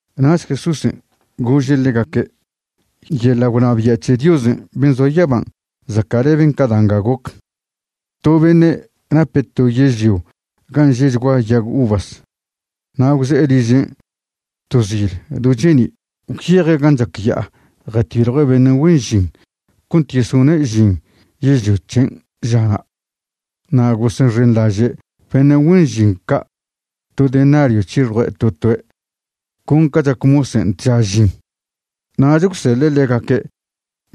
Nach Jesúsen' gože' ḻegaque': ―Yeḻa' gwnabia' c̱he Diosen' ben' zoa yaban' zaca'leben ca da' nga goc. To beṉe' nape' to yežlio gan' že'chgua yag uvas. Na' gwze'e ližen' to zil do cheni' gwyeje' gan' chac ya'a jatiljue' beṉe' güen žin cont yesone' žin yežlio c̱hen' žana'. Na' gosexenḻaže' beṉe' güen žin ca' to denario c̱hixue' to toe' con ca chac mosen' tža žin. Nach gwseḻe' ḻegaque'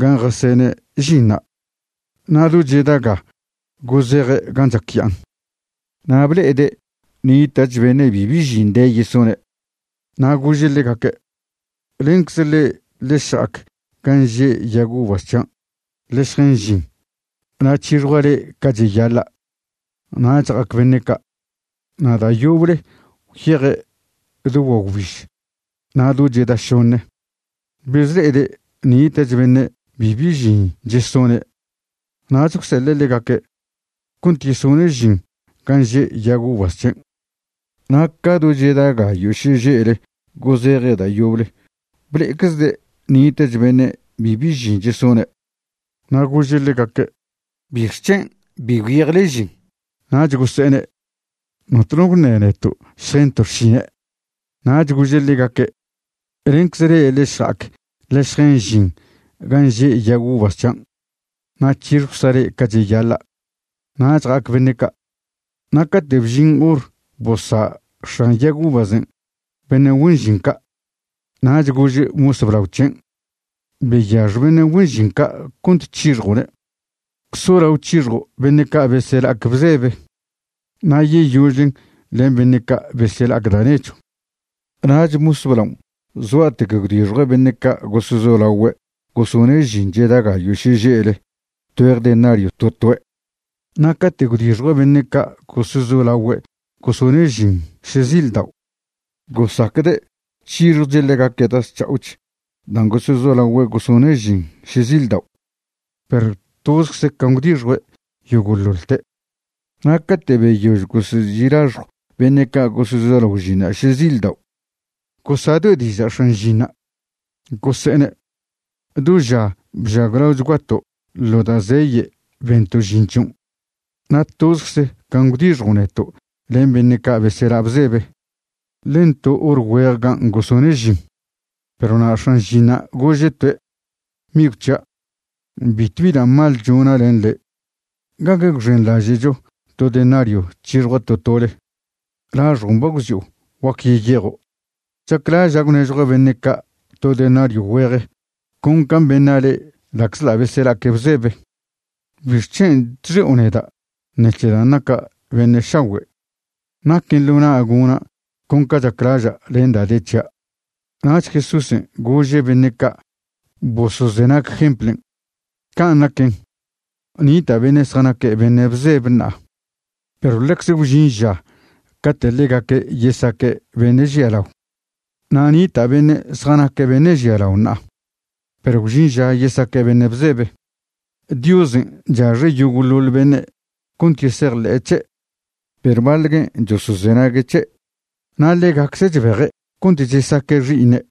gan' jasene' žinṉa'. Na' do cheda ga gozeje' gan' chac ya'an, na' ble'ede' nita'ch beṉe' bibi žin de yesone'. Na' gože' ḻegaque': “Lencze le'e ḻe šja'ac gan' že' yag uvas c̱hian' ḻe šjen žin na' c̱hixjwcza' le'e ca cheyaḻa'.” Nach ja'ac beṉe' ca'. Na' da' yoble gwyeje' do guagwbiž na' do cheda šoṉe. Bezle'ede' nita'ch beṉe' bibi žin chesone' nach gwseḻe' ḻegaque' cont yesone' žin gan' že' yag uvas c̱hen'. Na' ca do cheda gayo' šeže'le gozeje' da' yoble ble'eczde' nita'ch beṉe' bibi žin chesone'. Na' gože' ḻegaque': “¿Bixc̱hen' bi gwyejle žin?” Nach gose'ene': “Notno gwṉe neto' šjento' xšine'.” Nach goze'e ḻegaque': “Lencze le'e ḻe šja'ac ḻe šjen žin gan' že' yag uvas c̱hian'. Na' c̱hixjwcza' le'e ca cheyaḻa'.” Nach ja'ac beṉe' ca'. Na' cate' bžin hor bosa' x̱an yag uvasen' beṉe' güen žin ca', nach gože' mos blao c̱hen': “Beyax beṉe' güen žin ca' cont c̱hixjo'ne', solao c̱hixjo' beṉe' ca' besela'ac bzebe, na' yeyožle len beṉe' ca' besela'ac da' nechw.” Nach mos blaon' zgua'tec gwdixjue' beṉe' ca' gosezolagüe' gosone' žin cheda gayo' šeže'le tgüeje denario to toe'. Na' cate' gwdixjue' beṉe' ca' gosezolagüe' gosone' žin šezildao', gosacde' c̱hixjoche' ḻegaque' da' zc̱ha'och dan' gosezolagüe' gosone' žin šezildao'. Perw tozcze can' gwdixjue' yogo'ḻoḻte'. Na' cate' beyož gosezi' laxjw beṉe' ca' gosezolao žinṉa' šezildao', gosadoe' diža' x̱an žinṉa'. Gose'ene': “Do ža bžaglaochguato' ḻo da' zeye' bento' žin c̱hion'. Na' tozcze can' gwdixjo' neto' len beṉe' ca' besela' bzebe, len to hor güejgan' gosone' žin.” Perw na' x̱an žinṉa' gože' toe': “Migw c̱hia', bitwbi da' mal chona' len le'. ¿Gague gwxenḻažo' to denario c̱hixjua' to tole? Laxjon' ba gwxi'o, guac yeyejo'. Chaclaža' gwnežjua' beṉe' ca' to denario güeje con can' beṉa' le'e ḻa'czḻa' besela'aque' bzebe. ¿Bixc̱hen' chxi'o neda' ṉec̱he dan' naca' beṉe' šagüe'? Naquen ḻo na' gona' con ca chaclaža' len da' de c̱hia'.” Nach Jesúsen' gože' beṉe' ca' bosozenag jemplen': ―Can' naquen, nita' beṉe' zjanaque' beṉe' bzebe ṉa'a, perw ḻecze gwžin ža cate' ḻegaque' yesaque' beṉe' žialao. Na' nita' beṉe' zjanaque' beṉe' žialao ṉa'a, perw gwžin ža yesaque' beṉe' bzebe. Diosen' chaxe' yogo'ḻoḻ beṉe' cont yesejḻe'e c̱he', perw baḻ guen' chosozenague' c̱he', na' ḻegacze' chbeje' cont chesaque' xi'iṉe'.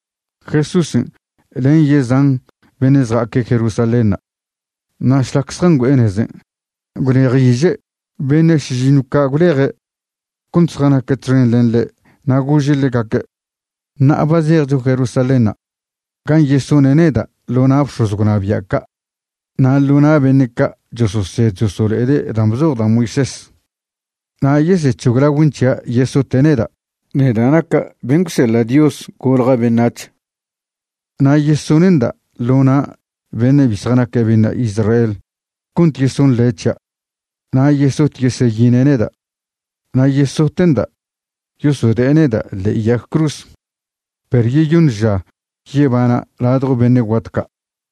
Jesúsen' len yezan beṉe' zja'aque' Jerusalénṉa'. Na' šlac zjangüe'e nezen' gwlejiže' beṉe' šižiṉw ca' gwleje' cont zjanaque' txen len ḻe' na' gože' ḻegaque': ―Ṉa'a ba zejcho Jerusalénṉa' gan' yesone' neda' ḻo na' bx̱oz gwnabia' ca' na' ḻo na' beṉe' ca' chososed chosolo'ede' dan' bzoj da' Moisés, na' yesec̱hoglagüen' c̱hia' yesote' neda', neda' naca' ben' gwseḻa' Dios golja' beṉac̱h. Na' yesone'nda' ḻo na' beṉe' bi zjanaque' beṉe' Israel cont yesonḻe' c̱hia', na' yesot yeseyine' neda', na' yesote'nda' yosode'e neda' ḻe'e yag cruz, perw yeyoṉ ža yebana' ladjo beṉe' guat ca'.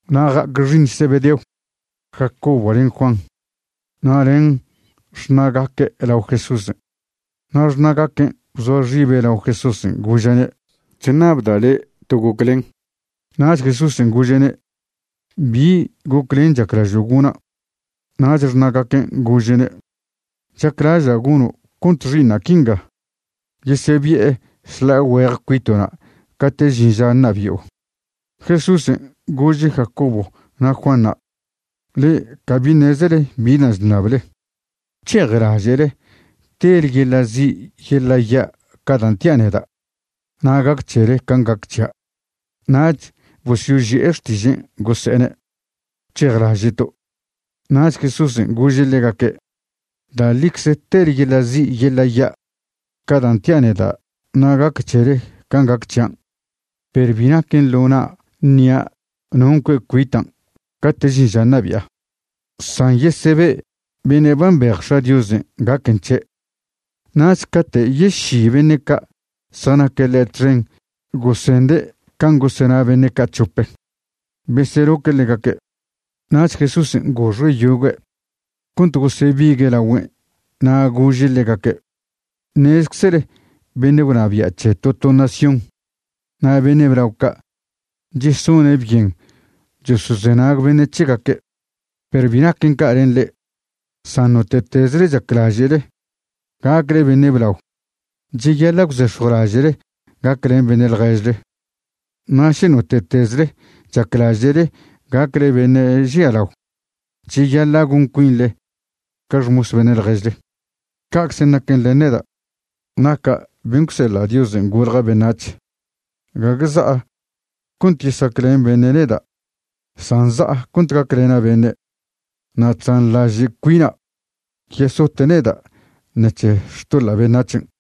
Na' ja'ac xi'iṉ Zebedeo, Jacobo len Juan, na' len xṉa'gaque' lao Jesúsen'. Na' xṉa'gaquen' bzoa xibe' lao Jesúsen' gože'ne': ―Chṉabda' le' to goclen. Nach Jesúsen' gože'ne': ―¿Bi goclen chaclažo' gona'? Nach xṉa'gaquen' gože'ne': ―Chaclaža' gono' cont xi'iṉa' quinga yesebi'e šḻa'a güeje cuito'na' cate' žin ža ṉabi'o. Jesúsen' gože' Jacobo na' Juanṉa': ―Le'e cabi ṉezele bi dan' chṉable. ¿Gwc̱hejlaže'le tele yeḻa' zi' yeḻa' ya' ca dan' tia' neda' na' gac c̱hele can' gac c̱hia'? Nach bosyoži'e xtižen' gose'ene': ―Gwc̱hejlaže'to'. Nach Jesúsen' gože' ḻegaque': ―Da' ḻicze tele yeḻa' zi' yeḻa' ya' ca dan' tia' neda' na' gac c̱hele can' gac c̱hian', perw bi naquen ḻo na' ṉia' non' cue' cuitan' cate' žin ža ṉabi'a, san yesebe' beṉe' ba mbej X̱a' Diosen' gaquen c̱he'. Nach cate' yeši beṉe' ca' zjanaque' ḻe' txen gosende' can' gosena beṉe' ca' c̱hope, beseloque' ḻegaque'. Nach Jesúsen' goxe' yogüe' cont gosebigue' lagüen' na' gože' ḻegaque': ―Ṉezeczele beṉe' gwnabia' c̱he to to nación na' beṉe' blao ca' chesone' byen chosozenag beṉe' c̱hegaque'. Perw bi naquen ca' len le'e. San note'tezle chaclaže'le gacle beṉe' blao, cheyaḻa' gwzex̱jwlaže'le gaclen beṉe' ḻježle. Na' še note'tezle chaclaže'le gacle beṉe' žialao, cheyaḻa' gon cuinḻe ca xmos beṉe' ḻježle. Ca'cze naquen len neda' naca' ben' gwseḻa' Diosen' golja' beṉac̱h. Gague za'a cont yesaclen beṉe' neda' san za'a cont gaclena' beṉe', na' chzanḻaže' cuina' yesote' neda' ṉec̱he xtoḻa' beṉac̱hen'.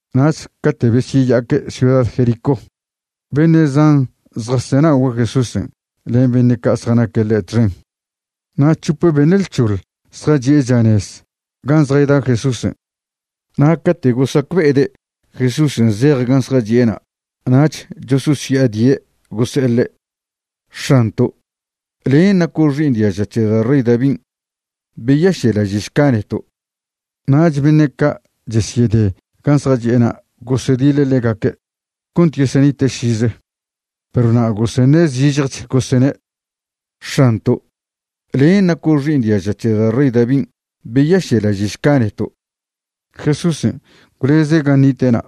Nach cate' besyeya'aque' ciuda Jericó, beṉe' zan zjasenagüe' Jesúsen' len beṉe' ca' zjanaque' ḻe' txen. Na' c̱hope beṉe' lc̱hoḻ zjachi' chanez gan' zjayda Jesúsen'. Na' cate' gosacbe'ede' Jesúsen' zej gan' zjachi'ena' nach chososya'adie' gose'e ḻe': ―X̱anto', len' naco' xi'iṉ diaža c̱he da' rey Davin'. Beyaše'laže'šca neto'. Nach beṉe' ca' chesyede gan' zjachi'ena' gosediḻe' ḻegaque' cont yesenite' šize. Perw na' goseṉe' zižjech gose'ene': ―¡X̱anto', len' naco' xi'iṉ diaža c̱he da' rey Davin', beyaše'laže'šca neto'! Jesúsen' gwleze' gan' nite'na',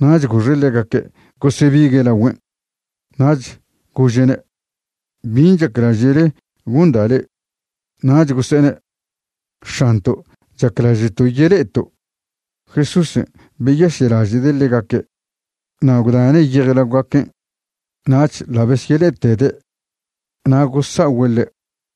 nach goxe' ḻegaque' gosebigue' lagüen'. Nach gože'ne': ―¿Bin' chaclaže'le gonda' le'e? Nach gose'ene': ―X̱anto', chaclaže'to' yele'eto'. Jesúsen' beyaše'laže'de' ḻegaque' na' gwdane' yejlaogaquen', nach ḻa' besyele'etede', na' gosa'ogüe' ḻe'.